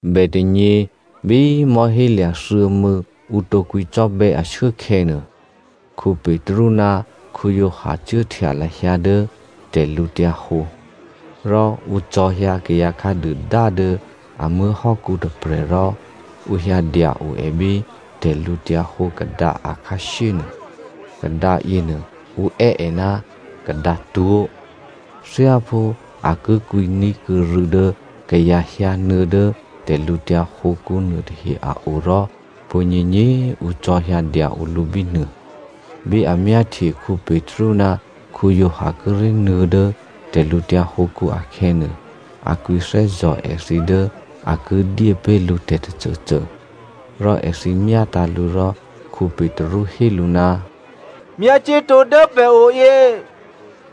Bètônyě bí mò̤́hélya̤ thuô̌mû̌, ǔ tǒ kwǐcò́bè̌ ashuốkhè̌nuô, Petru ná Giovanni cuốhtya lahyǎ dố tè̤lǔhǒdu. Rò ǔ cò̤̌hyǎ kayǎ khǎduôdá dố a muố̤hò́kǔ tôprè̤ rò ǔ hyǎ dya-o è bí tè̤lǔhǒdu kadǎ akhǎshyé nuô. Kadǎ yěnuô ǔ è́ è ná “kadǎtwó̤.” Thyáphú a ki kwǐní̤kuô̌ rû̌ dố kayǎ hyǎnuô̌ dố tè̤lǔtyǎ hǒkǔ nuôtahe a o rò pwǒ̤nyěnyě ǔ cò̤̌hyǎ dya-o lǔ bínuô. Bí a myáhtye Petru ná Giovanni kíré̤ nuô̌ dố tè̤lǔtyǎ hǒkǔ akhè̌nuô, a kwǐthè́zò̤ èthǐ dố a ki dyé pé̤ lǔ tè̤ tôcôcô. Rò èthǐ myátǎ̤ lǔ rò Petru hé lǔ, “Myácuốtǒ dố pè̤oyě!”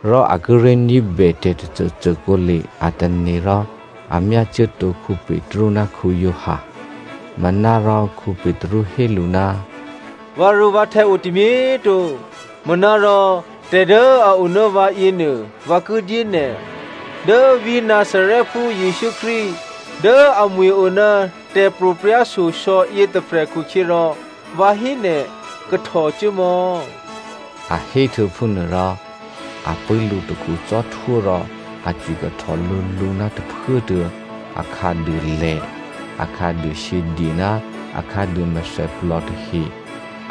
Rò a kíré̤ ní̤bè tè̤ tôcôcô kǒle a tane̤ rò a myácuốtǒ Petru ná Giovanni. Manárò Petru hé lǔ, “Vǎrû̌vǎhtè̌ o tômyé꤮ to, manárò tè̤ dố a o ná vǎ yěnuô, vǎ ki dyé nè̤. Dố vǐ̤ Nazarèphú Jesǔ Krístu dố amwi̤ o ná tè̤pro̤prya̤ shyosò̌ yětôprè̤ khukhyěrò vǎ hé nè̤, kahtò cuốmò̌!” A héhtuô̌ phúnuôrò a pṳ̂́ lǔtakhu cò́htwó rò a cwikahtò lǔlǔ ná tôphuốtuô̌ a khǎduôlè, akhǎduô shyědye ná akhǎduô mèthèplò tahe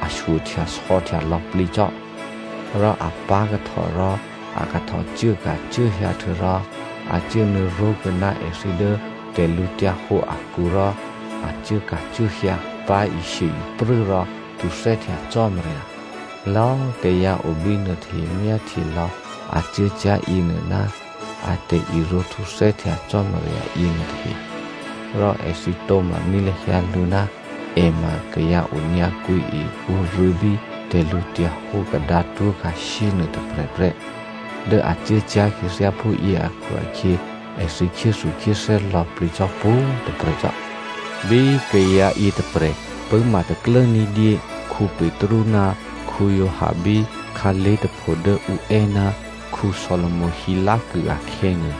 a shyohtyasò̌htya lò̌plǐ cò́. Rò a pá̤kahtò rò a kahtò cuốka̤cuốhyǎ htuô̌rò a cuốnuô̌ ró̤kuô̌ ná èthǐ dố tè̤lǔhǒdu akǔ rò a cuốka̤cuốhyǎ, pá̤ishye-iprû́ rò htuthè́htya Cò́marya. Lò̌꤮ kayǎ o bínuô tahe myáhtye lò̌ a cuốcyá̤ yěnuô ná a tè̤irǒhtuthè́htya Cò́marya yěnuô tahe. Rò èthǐ tǒ̤maní̤ lahyǎ lǔ ná è ma kayǎ onyǎkwǐe ǔrû̌ bí tè̤lǔhǒdu kadǎtwó̤ khǎshyé nuôtôprè̤ prè́. Dố a cuốcyá̤ khyěthyá phúyě akhu-akhyě èthǐ khyéthukhyéthè́ lò̌plǐ cò́ pwǒ̤꤮ tôprè̤ cò́. Bí kayǎ yětôprè̤ pṳ̂́ma taklố ní̤dyé Petru ná Giovanni bí khǎlé̤ tôpho dố ǔ è́ ná Solomo hilákû akhè̌nuô,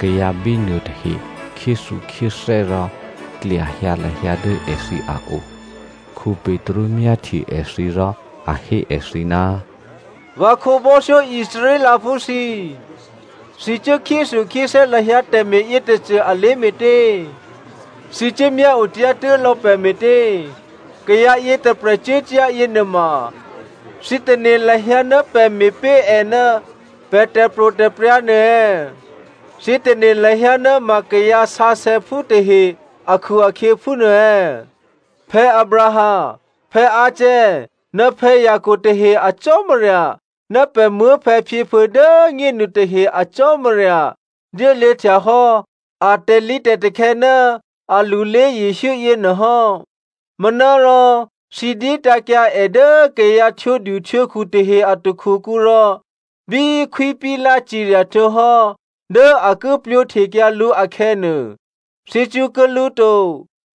kayǎ bínuô tahe khyéthukhyéthè́ rò klyahyǎ lahyǎ dố èthǐ a o. Petru myáhtye èthǐ rò a hé èthǐ, “Vǎ khǒbò́thyó Israelphú thǐ꤮ thǐ cuố khyéthukhyéthè́ lahyǎ tè̤me̤ yětôcô alé̤ me̤tě? Thǐ cuố myáotyá̤ tuố̤ lò̌ pè̤ me̤tě? Kayǎ yětôprè̤ cuốcyá̤ yěnuôma thǐ tane̤ lahyǎ ná pè̤ me̤ pé̤ è ná pè̤ tè̤pro̤tè̤prya̤ nuô è̌? Thǐ tane̤ lahyǎ ná ma kayǎ sǎsè̌phú tahe akhu-akhyě phúnuô è̌? Abraham, Isaac ná Jacob tahe a Cò́marya ná pè̤ muố̤phè̌phyěphuô̌ dố꤮ nyénu tahe a Cò́marya dyéluô̌ htyahò́ a tè̤lǐtè̤takhè̌ ná alulé Jesǔ yěnuô hò́. Manárò thǐ dyétǎ̤kyǎ è dố kayǎ htwǒduhtwǒkhu tahe a takhukǔ rò bí Khwí Pilato cirya htuô̌hò́ dố a ki plwǒhtekyǎ lǔ akhè̌nuô, thǐ cṳ̌kuô̌ lǔ to.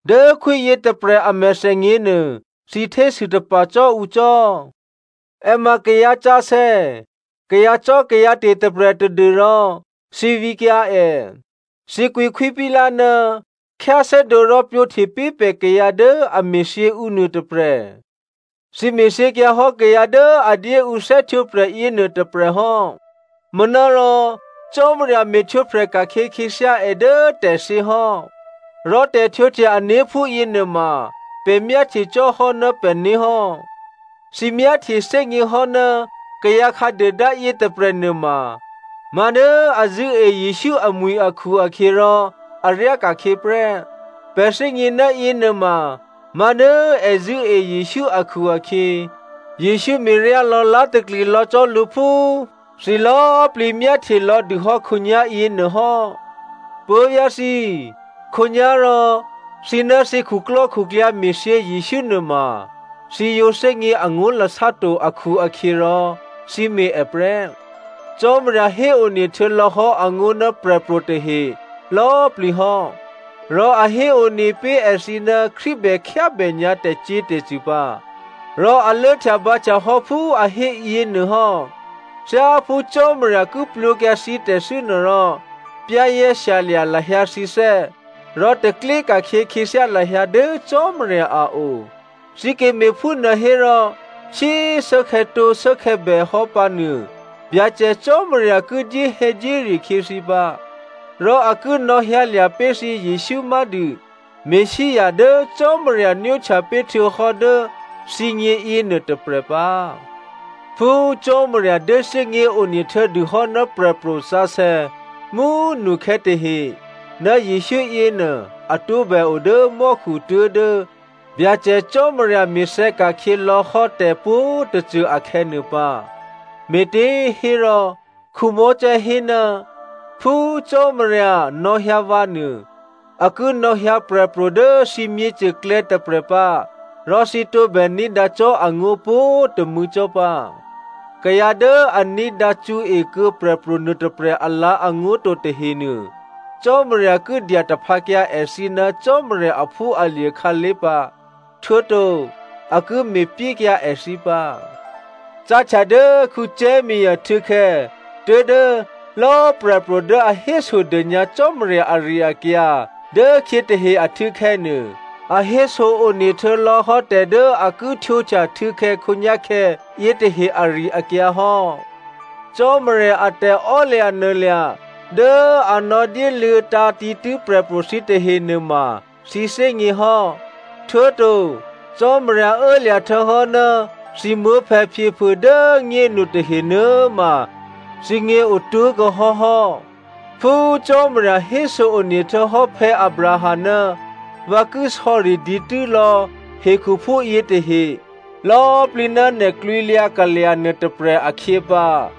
Dố khwí yětôprè̤ a mèthènyěnuô, thǐ htésû tapa̤ cò́ ǔ cò́. È ma kayǎsǎsè̌, kayǎcò́kayǎte̤ tôprè̤ tadû́rò thǐ vǐkyǎ è. Thǐ kwǐ Khwí Pilato, ‘Khyáthè́dǒ rò plwǒhte pé̤ pè̤ kayǎ dố a me̤thyě ǔ nuôtôprè̤.’ Thǐ me̤thyěkyǎhò́ kayǎ dố a dyé ǔ thè́htwǒprè̤ yěnuô tôprè̤ hò́, manárò Cò́marya me̤htwǒprè̤ ka̤khyě khyěthyá è dố tè̤thyě hò́, rò tè̤htwǒhtya-ané̤ phúyě nuôma pè̤ myáhtye cò́ hò́ ná pè̤né̤ hò́. Thǐ myáhtyethè́gněhò́ ná kayǎ khǎduôdá yětôprè̤ nuôma má̤dố a zṳ̂́e Jesǔ amwi̤ akhu-akhyěrò a ryáka̤khyě prè́. Pè̤ thè́gně ná yěnuôma má̤ dố è zṳ̂́e Jesǔ akhu-akhyě, Jesǔ me̤ryá lò̌lá̤takli lò̌ cò́ lǔ phú thǐ lò̌꤮ plǐ myáhtye lò̌dûhò́ khǒnyá̤ yěnuôhò́. “Puố̤vyá̤ thǐ꤮, khǒnyá̤rò, thǐ ná thǐ khuklò́khuklyǎ me̤thyě Jesǔ nuôma, thǐ yǒ thè́gně angó̤lasá to akhu-akhyěrò thǐ me̤ è prè́. Cò́marya héone htuô̌lò̌hò́ angó̤ ná prè̤pro̤ tahe lò̌꤮ plǐ hò́. Rò a héone pé̤ èthǐ ná Krístu bè khyábè nyǎ tè̤cyě̤tè̤cṳ̂ pǎ. Rò a lốhtyabǎhtya hò́ phú a hé yěnuô hò́. Thyáphú Cò́marya ki plwǒkyǎ thǐ tè̤thû́nuô rò, za̤ ní̤dû lahyǎ thǐné̤ rò taklyé ka̤khyě khyěthyá lahyǎ dố Cò́marya a o. Thǐ ki me̤phúnuô hérò shyé꤮ shuốkhè̌tǒ shuốkhè̌bè hò́ pǎnuô Byacè Cò́marya ki dyéhè̌dyére khyě thǐ pǎ. Rò a ki nò̌hyǎlya̤ pé̤ thǐ Jesǔ má̤dû Messia dố Cò́marya nwóhtya pé̤ htuô̌hò́ dố thǐgně yěnuô tôprè̤ pǎ. Phú Cò́marya dyé thè́gněone htuô̌dûhò́ ná prè̤pro̤ sǎsè̌ mú꤮ nukhè̌ tahe ná Jesǔ yěnuô a tǒbè o dố mò́khu tuố̤dố Byacè Cò́marya me̤thè̌ ka̤khyě lò̌hò́ tè̤pwǒ̤꤮ tôcô akhè̌nuô pǎ. Me̤těhérò Mosè hé, ‘Phú Cò́marya nò̌hyǎ vǎ nuô, a ki nò̌hyǎ prè̤pro̤ dố thǐ myěcôklè̌ tôprè̤ pǎ rò thǐ tǒbè ní̤dǎ cò́ angó̤ pwǒ̤꤮ tômû̌ cò́ pǎ. Kayǎ dố a ní̤dǎcṳ̌e kuô̌ prè̤pro̤ nuôtôprè̤ alǎ̤angó̤ to tahenuô, Cò́marya ki dyataphǎkyǎ èthǐ ná Cò́marya aphúalye̤ khǎlé̤ pǎ, htuô̌to a ki me̤pyékyǎ èthǐ pǎ.’ “Cáhtya dố Samuelè htû̌khè̌ tuố̤dố lò̌꤮ prè̤pro̤ dố a hésodônyǎ Cò́marya ari-akyǎ dố khyě tahe ahtû̌khè̌nuô, a héso-one htuô̌ lò̌ hò́ tè̤ dố a ki htwǒhtya htû̌khè̌ khǒnyá̤khè̌ yětahe ari-akyǎ hò́. Cò́marya a tè̤emaklò̤ dố a nò̌dyéluô̌tǎ̤ dǐtû́ prè̤pro̤ thǐ tahe nuôma thǐgně hò́. Htuô̌to Cò́marya ô̌lya̤ htuô̌hò́ ná thǐ muố̤phè̌phyěphuô̌ dố꤮ nyénu tahe nuô̌꤮ ma thǐgně otố̤kuô̌ hò́hò́. Phú Cò́marya héso-one htuô̌hò́ Abraham, ‘Vǎ ki sò̌ri dǐtû́ lò̌ hekhuphú yětahe lò̌꤮ plǐ ná nè̤ klwǐlyǎ kalya̤ nuôtôprè̤ akhyě pǎ.’